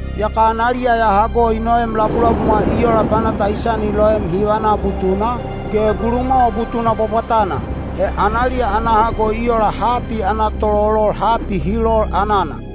Yaka analiya ya hago i noem labulabumwa i ola banata i sani loem hivana butuna, ge gulumwawa butuna bwabwatana. He analiya ana hago i ola hapi ana tololol hapi hi lol anana.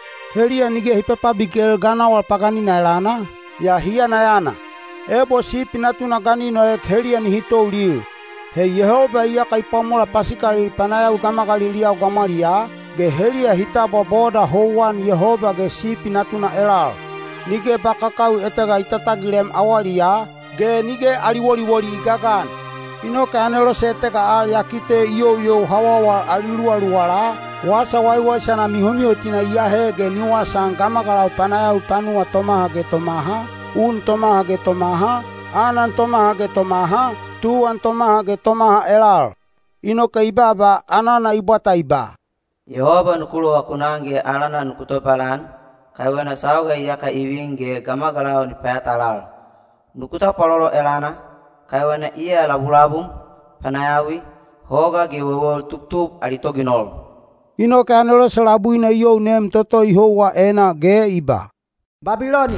Heliya nige hi papabikel ganawal paganina elana, yaa hi yanayana. Ebo Sipi Natuna ga ni noek heliya nihi toulil. He Yehoba iyaka i pwamola pasikalil panayawi gamagaliliyau gamwaliyaa, ge heliya hi tabwa boda houwan Yehoba ge Sipi Natuna elal. Nige ba kakawi etega i tatagilem awaliyaa, ge nige ali woliwoli i gagan. Inoke anelose etega al ya kite i youyou hawawal ali luwaluwala, wasa waiwaisana mihomihotina i ahe ge ni wasaan gamagalau panayawi panuwa tomaha ge tomaha, un tomaha ge tomaha, anan tomaha ge tomaha, tuwan tomaha ge tomaha elal. Inoke i baaba anana i bwata i ba, “Yehoba nuku lovakunan ge alana nuku tobalan, kaiwena sauga iyaka i vin ge gamagalau ni payatalal. Nuku tapwalolo elana, kaiwena iya labulabum, panayawi, hoga ge wewel tubtub ali toginol.” Inoke anelose labuina i you nem toto i houwa enaa ge i ba, “Babiloni,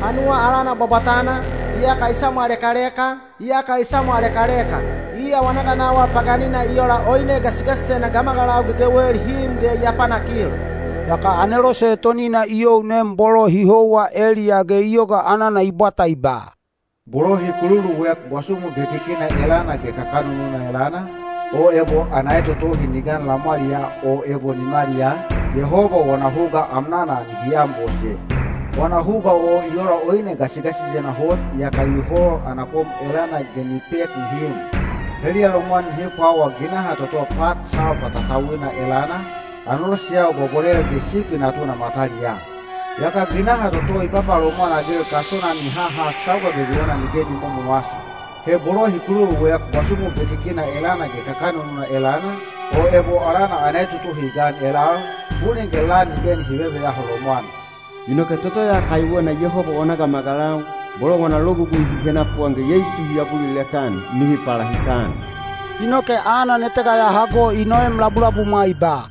panuwa alana bwabwatana, iyaka i samwalekaleka, iyaka i samwalekaleka. Iya wana ganawal paganina i ola oine gasigasisena gamagalau gegewel hi im ge i apanakil.” Yaka anelose etonina i you nem bolo hi houwa eliyaa ge i yoga anana i bwata i ba, “Bolo hi kululuek bwasumu bekikina elana ge kakanununa elana, o ebo ana etotohi ni gan lamwaliyaa o ebo nimaliyaa, Yehoba wana huga amnana nihi anbose. Wana huga o i ola oine gasigasisena hot iyaka i hol ana kom elana ge ni pek nihi im. Heliya lomwan nihi pwawa ginaha toto pat salpa tatauina elana, aneloseyau bwabwalel ge Sipi Natuna mataliyaa. Yaka ginaha toto i papalomwan-agil kasona ni haha sauga gegewena nige ni momowasi. He bolo hi kululuek bwasumu bekikina elana ge kakanununa elana, o ebo alana ana etotohi i gan elal, bulin ge lan nige nihi veveyaho lomwan.” Inoke toto ya kaiwena Yehoba wana gamagalau, bolo wana logugui hi henapuan ge Yeisu hi abulilek-an, nihi palahikan. Inoke anan etega ya hago i noem labulabumwa i ba,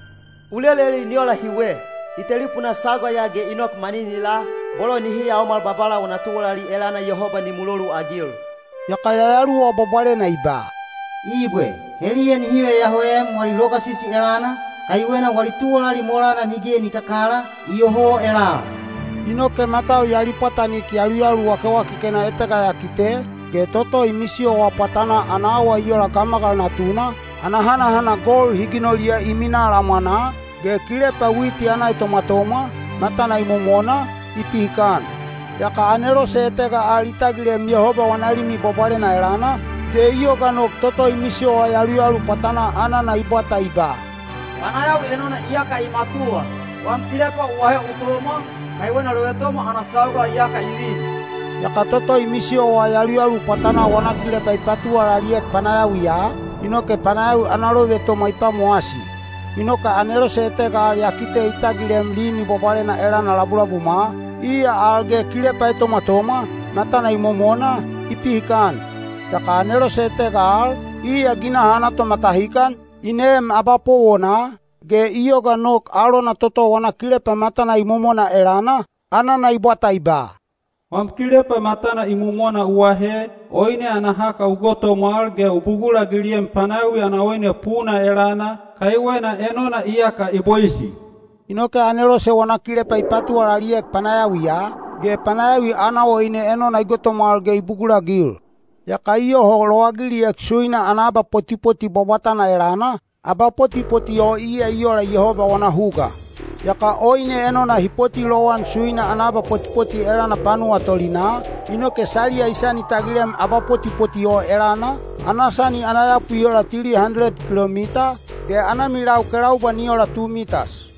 “U leleli ni ola hiwe: I telipunaa sauga ya ge ni nok maninilaa, bolo nihi yaomala Babala wana tuwalali elana Yehoba ni muloluagil.” Yaka Yayaluwa Bwabwalena i ba, “Ibwe, heliya nihi veyahoem wali logasisi elana, kaiwena wali tuwalali molana nige ni kakala, iyoho elal.” Inoke matau ya lipwatanik yaluyalu wakewakekena etega ya kite, ge toto i misiyowa pwatanaa ana awa i ola gamagal natuna, ana hanahana gold hi ginoliya i minaa lamwanaa, ge kilepa witi ana etomwatomwa, matana imomona, i pihikan. Yaka anelose etega al i tagilem Yehoba wana Limi Bwabwalena elana, ge i yoga nok toto i misiyowa yaluyalu pwatanaa anana i bwata i ba, “Panayawi enona iyaka i matuwa. Wam kilepa u ahe u tomwa, kaiwena lovetomwa ana sauga iyaka i vin.” Yaka toto i misiyowa yaluyalu pwatanaa wana kilepa i patuwalaliek panayawiya, inoke panayawi ana lovetomwa i pwamowasi. Inoke anelose etega al ya kite i tagilem Limi Bwabwalena elana labulabumwa, iya al ge kilepa etomwatomwa, matana imomona, i pihikan. Yaka anelose etega al, iya ginaha ana tomatahikan, i neem abapowona, ge i yoga nok alona toto wana kilepa matana imomona elana, anana i bwata i ba, “Wam kilepa matana imomona u ahe, oine ana haka u gotomwal ge u bugulagiliem panayawi ana oine puna elana, kaiwena enona iyaka i boisi.” Inoke anelose wana kilepa i patuwalaliek panayawiya, ge panayawi ana oine enona i gotomwal ge i bugulagil. Yaka i yoho lowagiliek suina ana abapotipoti bwabwatana elana, abapotipoti o iya i ola Yehoba wana huga. Yaka oine enona hi poti lowan suina ana abapotipoti elana panuwa tolinaa, inoke saliya i sani tagilem abapotipoti o elana, ana sani ana yapu i ola tili handeled kilomita, ge ana milau kelaubwa ni ola tu mitas.